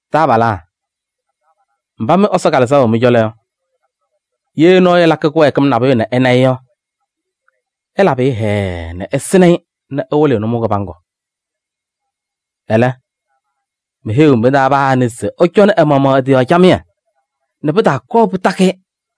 Taabalaa! Mba mɩ Ɛsɔ Kalɩzaɣ wɛ mɩ-cɔlɔ yɔ, ye nɔɔyʋ ɛlakɩ kɩwɛɛkɩm nabʋyʋ nɛ ɩna-ɩ yɔ, ɩlabɩ-ɩ hɛɛɛ nɛ ɩsɩnɩ-ɩ nɛ ɩwɩlɩ-ɩ nʋmɔʋ kɩbaŋgʋ. Ɛlɛ, meheyiɣ mɩ-taa paa anɩ se ɛcɔnɩ ɛ-maɣmaɣ ɛ-tɩ yɔɔ camɩyɛ nɛ pɩtaakɔɔ pɩtakɩ-ɩ.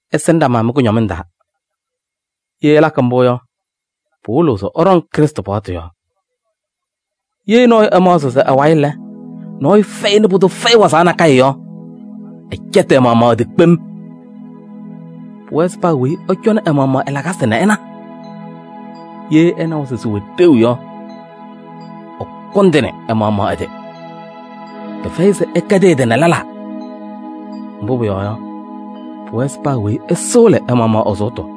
Ɩsɩnɩ ɖama mɩ-kʋñɔmɩŋ taa. Ye ɩlakɩ mbʋ yɔ, pɩwɩlɩɣ se ɩɖɔŋ Krɩstʋ paɣtʋ yɔɔ. Ye nɔɔyʋ ɛmaɣzɩɣ se ɛ-wayɩ lɛ, nɔɔyʋ fɛyɩ nɛ pʋdʋ fɛyɩ wazaɣ nakɛyɛ yɔ, ɛcɛtɩ ɛ-maɣmaɣ ɛ-tɩ kpem. Pʋwɛɛ se paa weyi ɛcɔnɩ ɛ-maɣmaɣ ɛ-lakasɩ nɛ ɛna. Ye ɛnawa se sɩwɛ ɖeu yɔ, ɛkʋndɩnɩ ɛ-maɣmaɣ ɛ-tɩ. Pɩfɛyɩ se ɛkɛdɩ ɛ-tɩ nɛ lɛlaa. Mbʋ pʋyɔɔ yɔ, pʋwɛɛ se paa weyi ɛsɩɣlɩ ɛ-maɣmaɣ ɛ-sʋʋtʋ.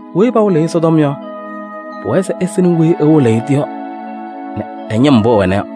Weyi pawɩlɩɣ Ɛsɔtɔm yɔ, pʋwɛɛ se ɛsɩnɩ weyi ɛwɩlɩɣ-ɩ yɔ nɛ ñɩm mbʋ ɛwɛna yɔ.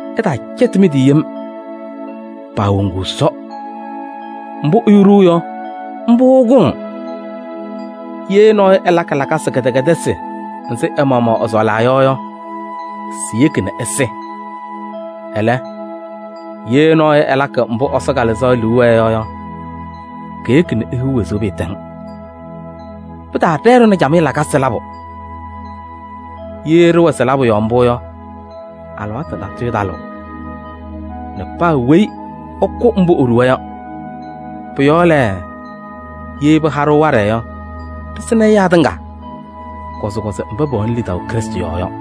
Ɩtaacɛtɩ mɩ-tɩ yem: paawoŋuu Ɛsɔ. Mbʋ ɛyʋ ɖuu yɔ, mbʋ ɛkʋŋ: ye nɔɔyʋ ɛlakɩ lakasɩ kɩdɛkɛdɩsɩ nzɩ ɛ-maɣmaɣ ɛsɔɔlaa yɔ yɔ, siyeki nɛ ɛsɩ. Ɛlɛ, ye nɔɔyʋ ɛlakɩ mbʋ Ɛsɔ Kalɩzaɣ liu wɛɛ yɔ yɔ, keyeki nɛ ehiɣ wezuu pɩɩtɛŋ. Pɩtaaɖɛɛ-ɖʋ nɛ camɩyɛ lakasɩ labʋ. Ye ɖɩwɛ sɩ-labʋ yɔɔ mbʋ yɔ, alɩwaatʋ talɩɣ lɛ, paa weyi ɛkʋ mbʋ eɖuwa yɔ. Pʋ-yɔɔ lɛ, ye pɩha-ɖʋ waɖɛ yɔ, ɖɩsɩnɩ ɛyaa tɩŋa, kɔzɩkɔzɩ mba pɛwɛnɩ lidaʋ Krɩstʋ yɔɔ yɔ.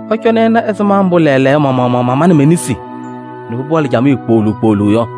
Ɩcɔnɩ ɩna ɛzɩma mbʋ lɛɛlɛɛyɔ ma-maɣmaɣ mamanɩ me-nesi nɛ pɩpaɣlɩ camɩyɛ kpooluu kpooluu yɔ.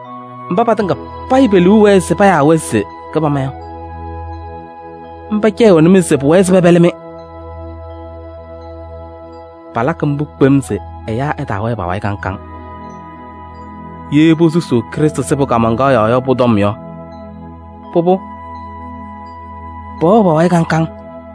Mba patɩŋa payɩ pe-liu wɛɛ se payaa-wɛ se kɩbama yɔ, mba cɛyɩɣnɩ-mɩ se pʋwɛɛ se pɛpɛlɩ-mɩ. Palakɩ mbʋ kpem se ɛyaa ɛtaawɛɛ pa-wayɩ kaŋ kaŋ. Ye posusuu Krɩstʋ sɩbʋ kaamaŋkaɣ yɔɔ yɔ pʋ-tɔm yɔ, pʋbʋ, pɛwɛɣ pa-wayɩ kaŋ kaŋ.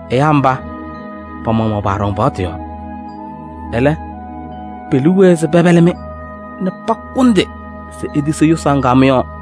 Ɛyaa mba, pa-maɣmaɣ paaɖɔŋ paɣtʋ yɔɔ. Ɛlɛ, pe-liu wɛɛ se pɛpɛlɩ-mɩ nɛ pakʋndɩ se itisi yʋsaɣ ŋga mɩ-yɔɔ.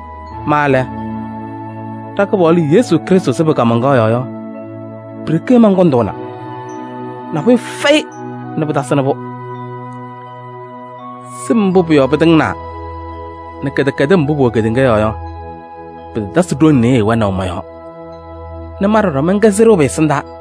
Ma lɛ, ɖa-Kɩpaɣlʋ Yesu Krɩstʋ sɩbʋ kaamaŋkaɣ yɔɔ yɔ, pi-ɖeke mankʋndʋʋna, nabʋyʋ fɛyɩ nɛ pɩtasɩnɩ-pʋ. Sɩm mbʋ pʋ-yɔɔ pɩtɩŋnaa nɛ kɩdɛkɛdɩm mbʋ pʋwɛ kedeŋa yɔɔ yɔ, pɩtatasɩ ɖoŋ nɩyɩɩ wɛnaʋ mɔ-yɔɔ nɛ ma ɖɔɖɔ mɛnkɛ sɩɖʋ pɩ-ɛsɩndaa.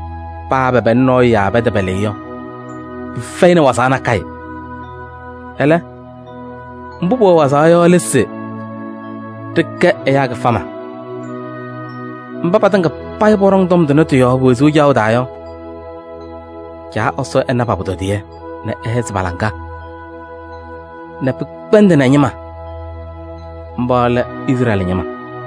Paa pɛpɛlɩ nɔɔyʋ yaa pɛtɛpɛlɩ-ɩ yɔ, pɩfɛyɩ wazaɣ nakɛyɛ. Ɛlɛ, mbʋ pʋwɛ wazaɣ yɔ lɛ se: ɖɩkɛ ɛyaa kɩfama. Mba patɩŋa payɩ pɔɖɔŋ tɔm tʋnɛ tɩ-yɔɔ pe-wezuu caɣʋ taa yɔ, Caa Ɛsɔ ɛna pa-pʋtɔdɩyɛ nɛ ɛhɛzɩ pa-laŋa nɛ pɩkpɛndɩnɩ ɛ-ñɩma, mba lɛ Izrɛɛlɩ ñɩma!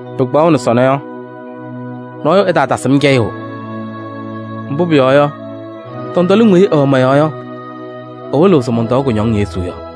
Pɩkpaɣʋnɩ sɔnɔ yɔ, nɔɔyʋ ɛtaatasɩ-m cɛyʋʋ, mbʋ pʋyɔɔ yɔ, tɔntɔlɩŋ weyi ɩwɛ mɔ-yɔɔ yɔ, ɩwɩlɩɣ se mɔntɔɔ kʋñɔŋ Yesu yɔɔ.